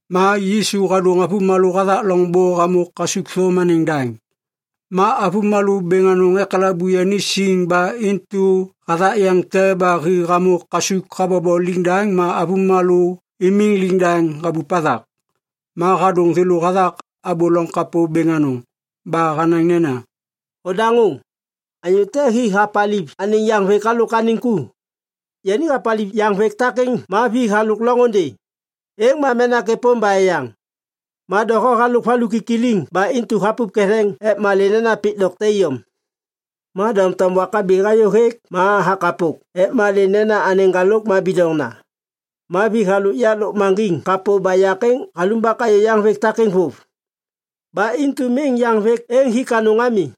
Ma Yisu hadôŋ avômalô hathak loŋbô hamô kasukthôm anêŋ daŋ. Ma avômalô bêŋ anôŋ ekalabu yani siŋ ba intu hathak yeŋ te ba hi hamô kasuk habobo liŋdaŋ ma avômalô imiŋ liŋdaŋ habup hathak. Ma hadôŋ thêlô hathak abô loŋ kapô bêŋ anôŋ. Ba hanaŋ nena, “Odaŋô! Anyô te hi hapaliv anêŋ yaŋvêk halôk anêŋ ku. Yani hapaliv yaŋvêk takêŋ ma vi halôk loŋôndê. Êŋ ma menak êpôm ba eyaŋ. Ma doho halôk valu kikiliŋ ba intu hapup ketheŋ ek malê nena pik dokte iyom. Ma doŋtom wak habi hayô hêk ma hakapok ek malê nena anêŋ ŋgalôk ma bidoŋna. Ma vi halôk loŋ yak lôkmaŋgiŋ kapô ba yak êŋ halumbak hayô yaŋvêk takêŋ vôv. Ba intu miŋ yaŋvêk êŋ hik anôŋ ami.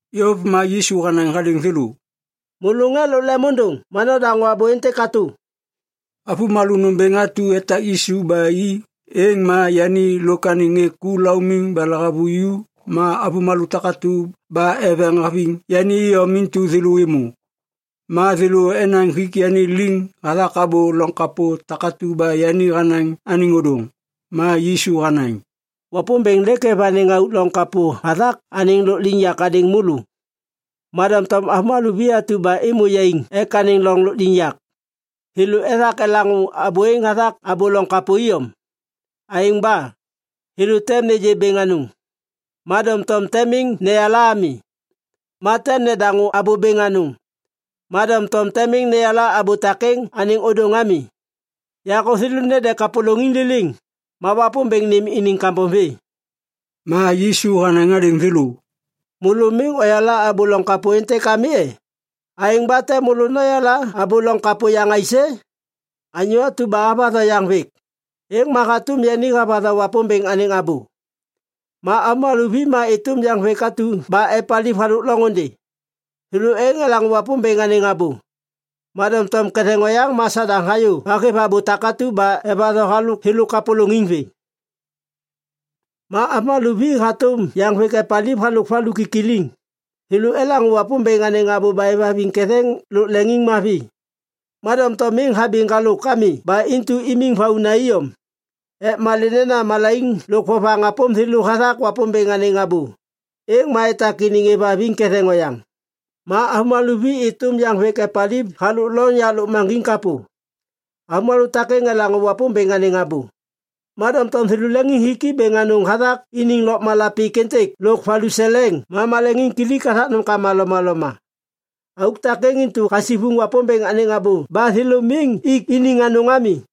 Yôv ma Yisu hanaŋ hadêŋ thêlô, “Môlô ŋê lôk lemôndôŋ ma nodaŋô abô êntêk katô!” Avômalô nômbêŋ atu etak Yisu ba i, êŋ ma yani lôk anêŋ ŋê ku laumiŋ ba lahavuju ma avômalô takatu ba eveŋ haveŋ yani iyom intu thêlô êmô. Ma thêlô enaŋ hik yani liŋ hathak abô loŋ kapô takatu ba yani hanaŋ anêŋ ôdôŋ. Ma Yisu hanaŋ, “Wapômbêŋ lêk hêv anêŋ auk loŋ kapô hathak anêŋ loŋ lôkliŋyak hadêŋ môlô. Ma doŋtom avômalô vi atu ba êmô yaiŋ ek anêŋ loŋ lôkliŋyak, thêlô ethak elaŋô abô êŋ hathak abô loŋ kapô iyom. Aêŋ ba, “‘thêlô tem nêgê bêŋ anôŋ, ma doŋtom tem miŋ neyala ami. Ma tem nedaŋô abô bêŋ anôŋ, ma doŋtom tem miŋ neyala abô takêŋ anêŋ ôdôŋ ami. Yakô thêlô nede kapôlôŋiŋ liliŋ, ma Wapômbêŋ nêm iniŋ kambom vê.’” Ma Yisu hanaŋ hadêŋ thêlô, “Môlô miŋ oyala abô loŋ kapô êntêk ami e? Aêŋ ba tem môlô noyala abô loŋ kapô yaŋ aisê? Anyô atu ba havatho yaŋvêk, êŋ ma hatôm yani havatho Wapômbêŋ anêŋ abô. Ma avômalô vi ma êtôm yaŋvêk atu ba epaliv halôk loŋôndê. Thêlô êŋ elaŋô Wapômbêŋ anêŋ abô. Ma doŋtom ketheŋ oyaŋ ma Sadaŋ hayô ba hêv abô takatu ba evatho halôk thêlô kapôlôŋiŋ vê. Ma avômalô vi ma hatôm yaŋvêk epaliv halôk valu kikiliŋ. Thêlô elaŋô Wapômbêŋ anêŋ abô ba êvhaviŋ ketheŋ lôk leŋiŋmavi. Ma doŋtom miŋ habi ŋgalôk ami ba intu imiŋ vauna iyom. Ek malê nena malaiŋ lôk vovaŋ hapôm thêlô hathak Wapômbêŋ anêŋ abô, êŋ ma etak iniŋ êvhaviŋ ketheŋ oyaŋ. Ma avômalô vi êtôm yaŋvêk epaliv halôk loŋ yak lôkmaŋgiŋ kapô. Avômalô takêŋ elaŋô Wapômbêŋ anêŋ abô, ma doŋtom thêlô leŋiŋhiki bêŋ anôŋ hathak iniŋ lôkmala pik êntêk lôk valuseleŋ ma maleŋiŋkilik hathak nômkama lomaloma. Auk takêŋ intu hasivuŋ Wapômbêŋ anêŋ abô ba thêlô miŋ ik iniŋ anôŋ ami.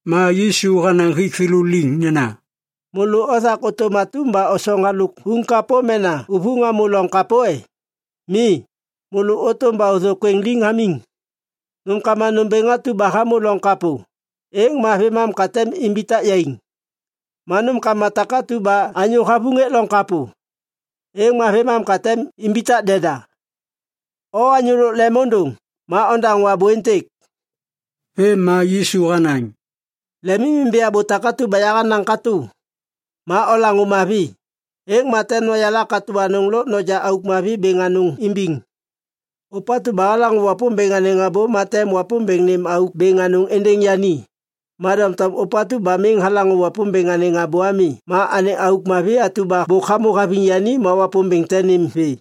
Ma Yisu hanaŋ hik thêlô liŋ nena, “Môlô othak ôtôm atum ba osoŋ halôk uŋ kapô mena uvuŋ hamô loŋ kapô e? Mi, môlô ôtôm ba ôthôkwêŋ liŋ hamiŋ. Nômkama nômbêŋ atu ba hamô loŋ kapô, êŋ ma vêmam ka tem imbitak yaiŋ. Ma nômkama takatu ba anyô havuŋ hêk loŋ kapô, êŋ ma vêmam ka tem imbitak deda. O anyô lôk lemôndôŋ ma ondaŋô abô êntêk.” Vêm ma Yisu hanaŋ, “Lemimimbi abô takatu ba yahanaŋ katô. Ma olaŋô mavi, êŋ ma tem noyala katô anôŋ lôk noja auk mavi bêŋ anôŋ imbiŋ. Ôpatu ba halaŋô Wapômbêŋ anêŋ abô, ma tem Wapômbêŋ nêm auk bêŋ anôŋ êndêŋ yani. Ma doŋtom ôpatu ba miŋ halaŋô Wapômbêŋ anêŋ abô ami, anêŋ auk mavi atu ba bôk hamô haviŋ yani, Wapômbêŋ tem nêm vê.”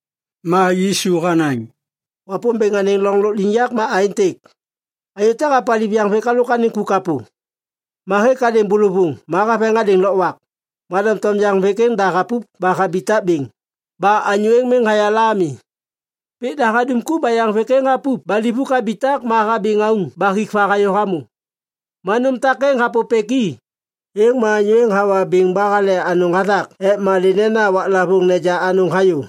Ma Yisu hanaŋ, “Wapômbêŋ anêŋ loŋ lôkliŋyak ma aêntêk. Anyô te hapaliv yaŋvêk halôk anêŋ ku kapô. Ma hêk hadêŋ bôlôvôŋ ma haveŋ hadêŋ lôkwak. Ma doŋtom yaŋvêk da hapup ba habitak bêŋ, ba anyô êŋ miŋ hayala ami. Pik da hadum ku ba yaŋvêk êŋ hapup ba livuk habitak ma habi ŋauŋ ba hik va hayô hamô. Ma nôm takêŋ hapôpêk i, êŋ ma anyô êŋ hawa biŋ ba hale anôŋ hathak ek malê nena waklavôŋ neja anôŋ hayô.”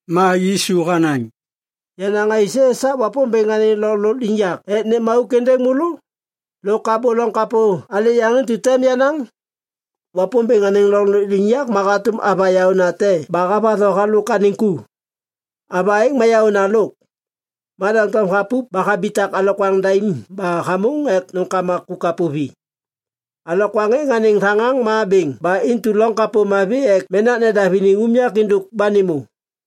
Ma Yisu hanaŋ, “Yanaŋ aisê esak Wapômbêŋ anêŋ loŋ lôkliŋyak ek nêm auk êndêŋ môlô? Lôk abô loŋ kapô alê yaŋ intu tem yanaŋ? Wapômbêŋ anêŋ loŋ lôkliŋyak ma hatôm ava yaônate ba havatho halôk anêŋ ku. Ava êŋ ma yaôna lôk. Ma doŋtom hapup ba habitak alokwaŋ daim ba hamôŋ ek nômkama ku kapô vi. Alokwaŋ êŋ anêŋ thaŋaŋ ma bêŋ ba intu loŋ kapô mavi ek menak nedav iniŋ unyak êndôk ba nêmô.”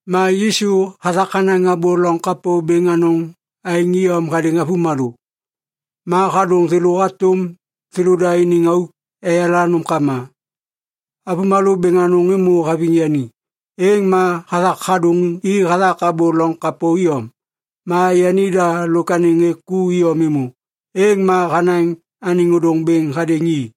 Ma Yisu hathak hanaŋ abô loŋ kapô bêŋ anôŋ aêŋ iyom hadêŋ avômalô. Ma hadôŋ thêlô hatôm thêlôda iniŋ auk eyala nômkama. Avômalô bêŋ anôŋ êmô haviŋ yani, êŋ ma hathak hadôŋ i hathak abô loŋ kapô iyom. Ma yanida lôk anêŋ ŋê ku iyom êmô, êŋ ma hanaŋ anêŋ ôdôŋ bêŋ hadêŋ i.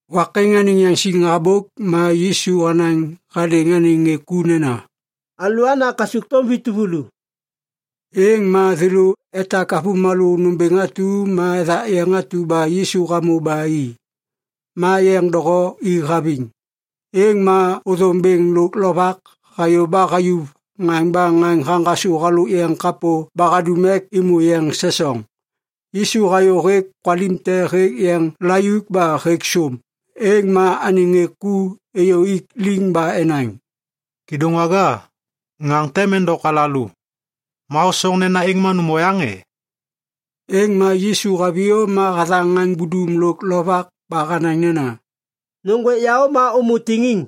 Wak êŋ anêŋ yaŋsiŋ habôk ma Yisu hanaŋ hadêŋ anêŋ ŋê ku nena, “Alôana kasukthôm vi tuvulu.” Êŋ ma thêlô etak avômalô nômbêŋ atu ma ethak yeŋ atu ba Yisu hamô ba i. Ma yeŋ doho i haviŋ. Êŋ ma ôthôm bêŋ lôk lovak hayô ba hayuv ŋaŋ ba ŋaŋ haŋgasô halôk yeŋ kapô ba hadum ek êmô yeŋ sesoŋ. Yisu hayô hêk kwalim te hêk yeŋ layuk ba hêk sôm. Êŋ ma anêŋ ŋê ku êyô ik liŋ ba enaŋ, “Kêdôŋwaga, ŋaŋ tem endok alalô. Ma hosoŋ nena êŋ ma nôm oyaŋ e?” Êŋ ma Yisu haviyô ma hathaŋ ŋaŋ budum lôk lovak ba hanaŋ nena, “Nôŋgwêk yaô ma ômô tiŋiŋ!”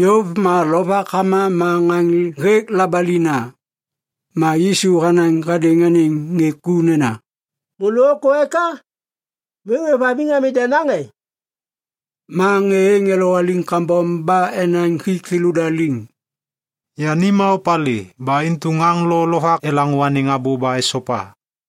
Yôv ma lovak hama ma ŋaŋ hêk labalina. Ma Yisu hanaŋ hadêŋ anêŋ ŋê ku nena, “Môlô ôkô eka? Miŋ ôêvhaviŋ ami denaŋ e?” Ma ŋê êŋ elowaliŋ kambom ba enaŋ hik thêlôda liŋ, “Yani ma opalê ba intu ŋaŋ lo lovak elaŋô anêŋ abô ba esopa.”